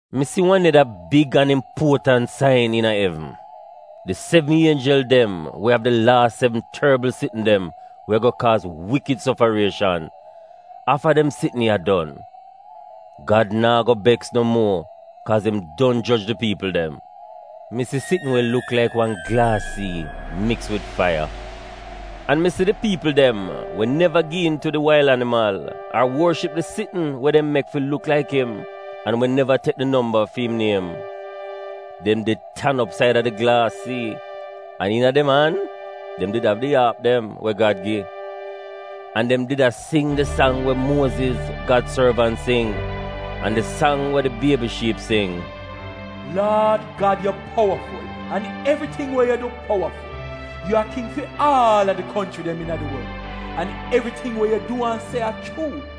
Mi si wan neda big an impuotant sain iina evn: di sevn ienjel dem we av di laas sevn torbl sitn dem we ago kaaz wikid sofarieshan — afta dem sitn ya don, Gad naa go beks no muo kaaz im don joj di piipl dem. Mi si sitn we luk laik wan glaas sii miks wid faiya. An mi si di piipl dem we neva gi iin tu di wail animal ar worship di sitn we dem mek fi luk laik im, an we neva tek di nomba fi im niem. Dem did tan op saida di glaas sii, an iina dem an dem did av di aap dem we Gad gi. An dem did a sing di sang we Muoziz, Gad sorvant, sing an di sang wa di Biebi Shiip sing: “Laad Gad yu powaful an evriting wa yu du powaful. Yu a King fi aal a di konchri dem iina di worl, an evriting wa yu du an se a chuu.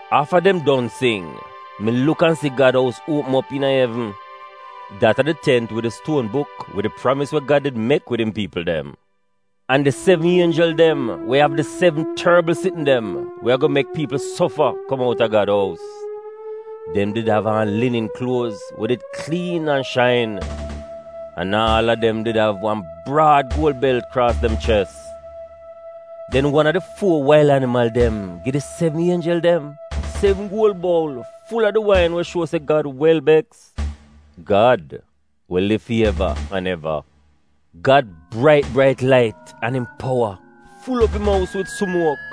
Afta dem don sing, mi luk an si Gad ous uopm op iina evn (dat a di tent wid di stuon buk wid di pramis we Gad did mek wid im piipl dem). An di sevn ienjel dem we av di sevn torbl sitn dem we ago mek piipl sofa kom outa Gad ous. Dem did av aan linin kluoz we did kliin an shain. An aal a dem did av aan wan braad guol belt kraas dem ches. Den wan a di fuo wail animal dem gi di sevn ienjel dem sevn guol boul ful a di wain we shuo se Gad wel beks — Gad we liv fi eva an eva. Gad brait brait lait an im powa ful op im ous wid sumuok.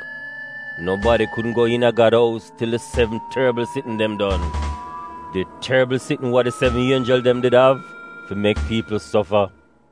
Nobadi kudn go iina Gad ous til di sevn torbl sitn dem don — di torbl sitn wa di sevn ienjel dem did av fi mek piipl sofa.